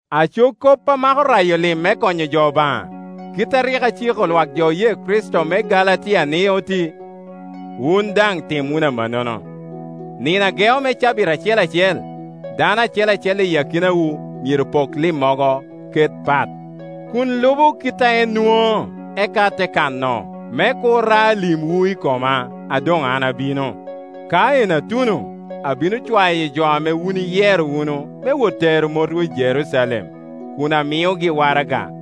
Aco kop a mako rayo lim me konyo jo Obaŋa: kit a rik aciko lwak oye Kricito me Galatia ni oti, wun daŋ tim wunu amannono. Nino a geo me cabit acel acel, dano acel acel i akinawu myero pok limmogo ket pat, kun lubo kit a en nwoŋo, eka te kano, me kur ra limwu i koma, a doŋ an abino. Ka en atuno abino cwayo jo ame wun iyero wunu me wot tero motwu i Jerucalem, kun amiogi waraga.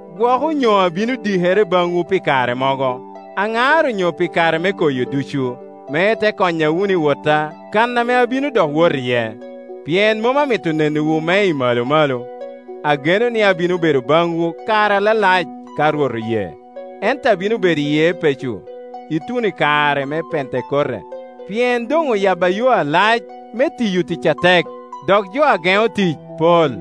Gwok onyo abino dikere baŋwu pi kare mogo, aŋar onyo pi kare me koyo ducu, me ite konya wunu i wotta kan ame abino dok wot iye. Pien mom amito nenowu me i malo malo; ageno ni abino bedo baŋwu kare alalac, ka Rwot oye. Ento abino bedo i Epeco ituno i kare me Pentekote, pien doŋ oyabba yo alac me tiyo tic atek, dok jo a geno tic pol.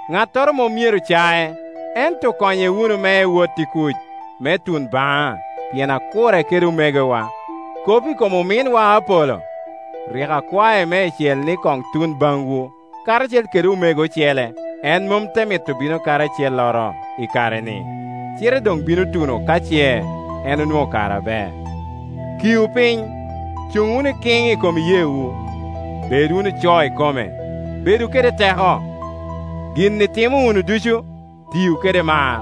ŋattoro mom myero cac, ento konye wunu me ewot i kuc, me tun baŋa, pien akure kede omegowa. Kop i kom ominwa Apolo, rik akwae meicel ni koŋ tun baŋwu, karacel kede omego ocele, en mom te mito bino kadi acelloro, i kare-ni; cite doŋ bino tuno ka ce en onwoŋo kare aber. Kiu piny, cuŋ wunu ikiŋ i kom iyeewu, bed wunu co ikome, bedu kede teko. Gin itimo wunu ducu, tiu kede mar.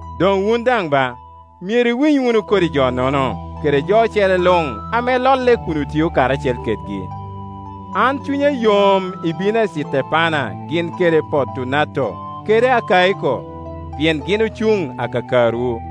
Doŋ wun daŋ ba, myero iwiny wunu kodi jo-nono, kede jo ocele luŋ ame lolle kun otio karacel kedgi. An cunya yom i bino a Citepana gin kede Portunato kede Akaiko, pien gin ocuŋ akakarwu.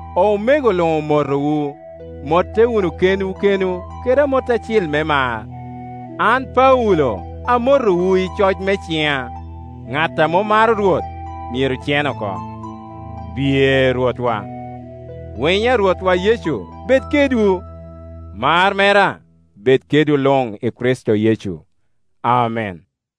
Omego luŋ omotowu. Motte wunu kenwu kenwu kede amot acil me mar. An Paulo amotowu i coc me ciŋa. Ŋat a mom maro Rwot myero cen oko. Biye Rwotwa! Winyo a Rwotwa Yecu bed kedwu. Mar mera bed kedwu luŋ i Kricito Yecu. Amen.